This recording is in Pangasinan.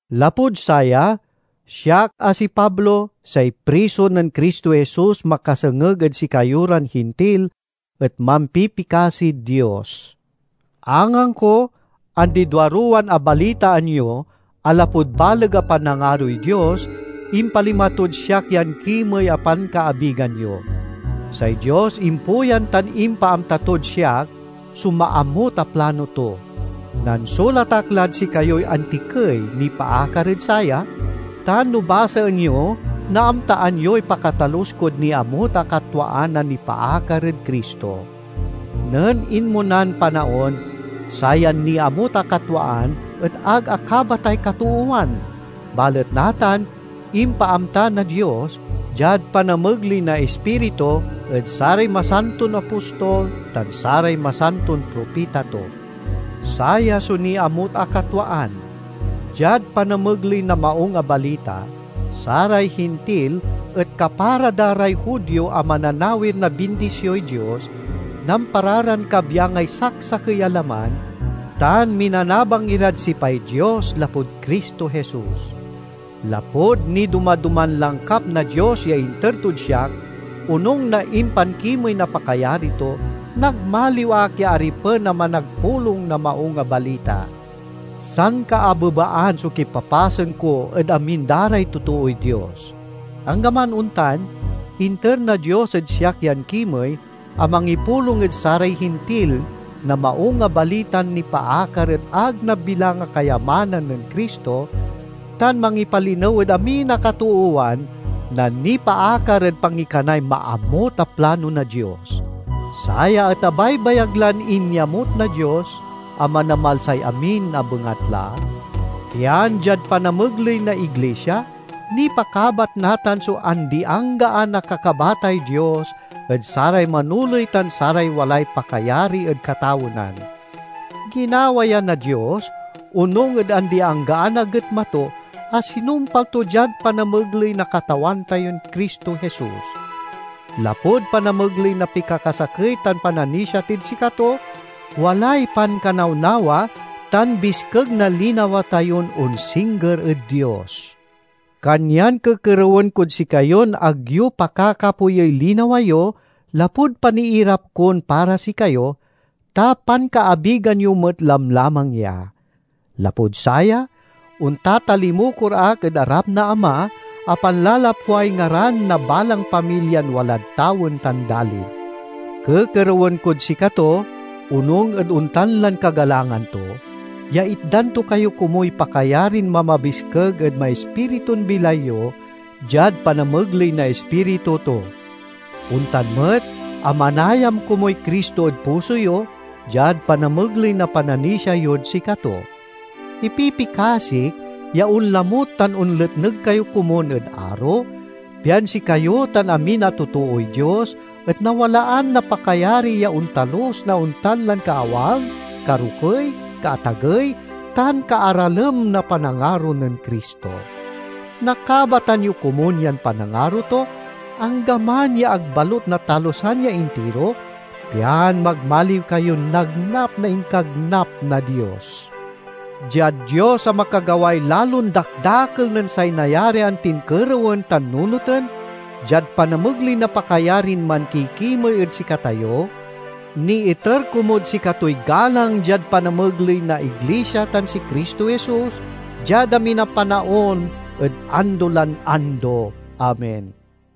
Lapud saya, siak a si Pablo, say priso nen Cristo Jesus makasengeg ed sikayo ran Hintil, et mampipikasid Dios. Angangko, andi duaruwan abalitaan yo a lapud baleg a panangaroy Dios, impalima tod siak yan kimey a pankaabigan yo. Say Dios impuyan tan impaamta tod siak so maamut a plano to. Nansulat ak lad sikayoy antikey nipaakar ed saya, tan no basaen yo naamtaan yoy pakatalus kod niamut a katwaan a nipaakar ed Cristo. Nen inmonan panaon, sayan niamut a katwaan et ag akabatay katoowan, balet natan impaamta na Dios, diad panamegley na Ispiritu, ed saray masanton apostol tan saray masanton propita to. Saya so niamut a katwaan: diad panamegley na Maung a Balita, saray Hintil et kapara da ray Judio a mananawir na bindisioy Dios, nampara ran kabyangay saksakey a laman, tan minanabang irad sipay Dios lapud Cristo Jesus. Lapud nidoma-doman langkap na Dios ya inter tod siak, onung na impankimey na pakayari to, nagmaliw ak ya aripen a managpulong na Maung a Balita. Sankaabebaan so kipapasen ko ed amin da ray totooy Dios; anggaman ontan, inter na Dios ed siak yan kimey a mangipulong ed saray Hintil na Maung a Balitan nipaakar ed ag nabilang a kayamanan nen Cristo, tan mangipalinew ed amin a katoowan na nipaakar ed pangikanay maamut a plano na Dios. Saya et abaybayag lan inyamut na Dios a Manamalsay amin a bengatla, pian diad panamegley na iglisia, nipakabat natan so andi-anggaan a kakabatay Dios ed saray manoley tan saray walay pakayari ed katawenan. Ginawa ya na Dios onung ed andi-anggaan a getma to, a sinumpal to diad panamegley na Katawan tayon Cristo Jesus. Lapud panamegley na pikakasakey tan pananisia tid sikato, walay pankanawnawa tan biskeg na linawa tayon onsingger ed Dios. Kanyan kekerewen kod sikayon ag yo pakakapoyey linawa yo lapud paniirap kon para sikayo, ta pankaabigan yo met lamlamang ya. Lapud saya, ontatalimukor ak ed arap na Ama a panlalapway ngaran na balang pamilyan walad tawen tan dalin. Kekerewen kod sikato, onung ed ontan lan kagalangan to, ya itdan to kayo komuy pakayarin mamabiskeg ed maispiritun bilay yo diad panamegley na Ispiritu to. Ontan met a manayam komuy Cristo ed puso yo, diad panamegley na pananisia yod sikato. Ipipikasik ya onlamut tan onletneg kayo komun ed aro, pian sikayo tan amin a totooy Dios et nawalaan na pakayari ya ontalus na ontan lan kaawang, karokey, kaatagey tan kaaralem na panangaro nen Cristo. Nakabatan yo komun yan panangaro to, anggaman ya ag balut natalusan ya intiro, pian magmaliw kayon nagnap na inkagnap na Dios. Diad Dios a makagaway lalon dakdakel nen say nayarian tin kerewen tan nunoten, diad panamegley na pakayarin mankikimey ed sikatayo: niiter komud sikatoy galang diad panamegley na iglisia tan si Cristo Jesus, diad amin a panaon ed ando lan ando! Amen.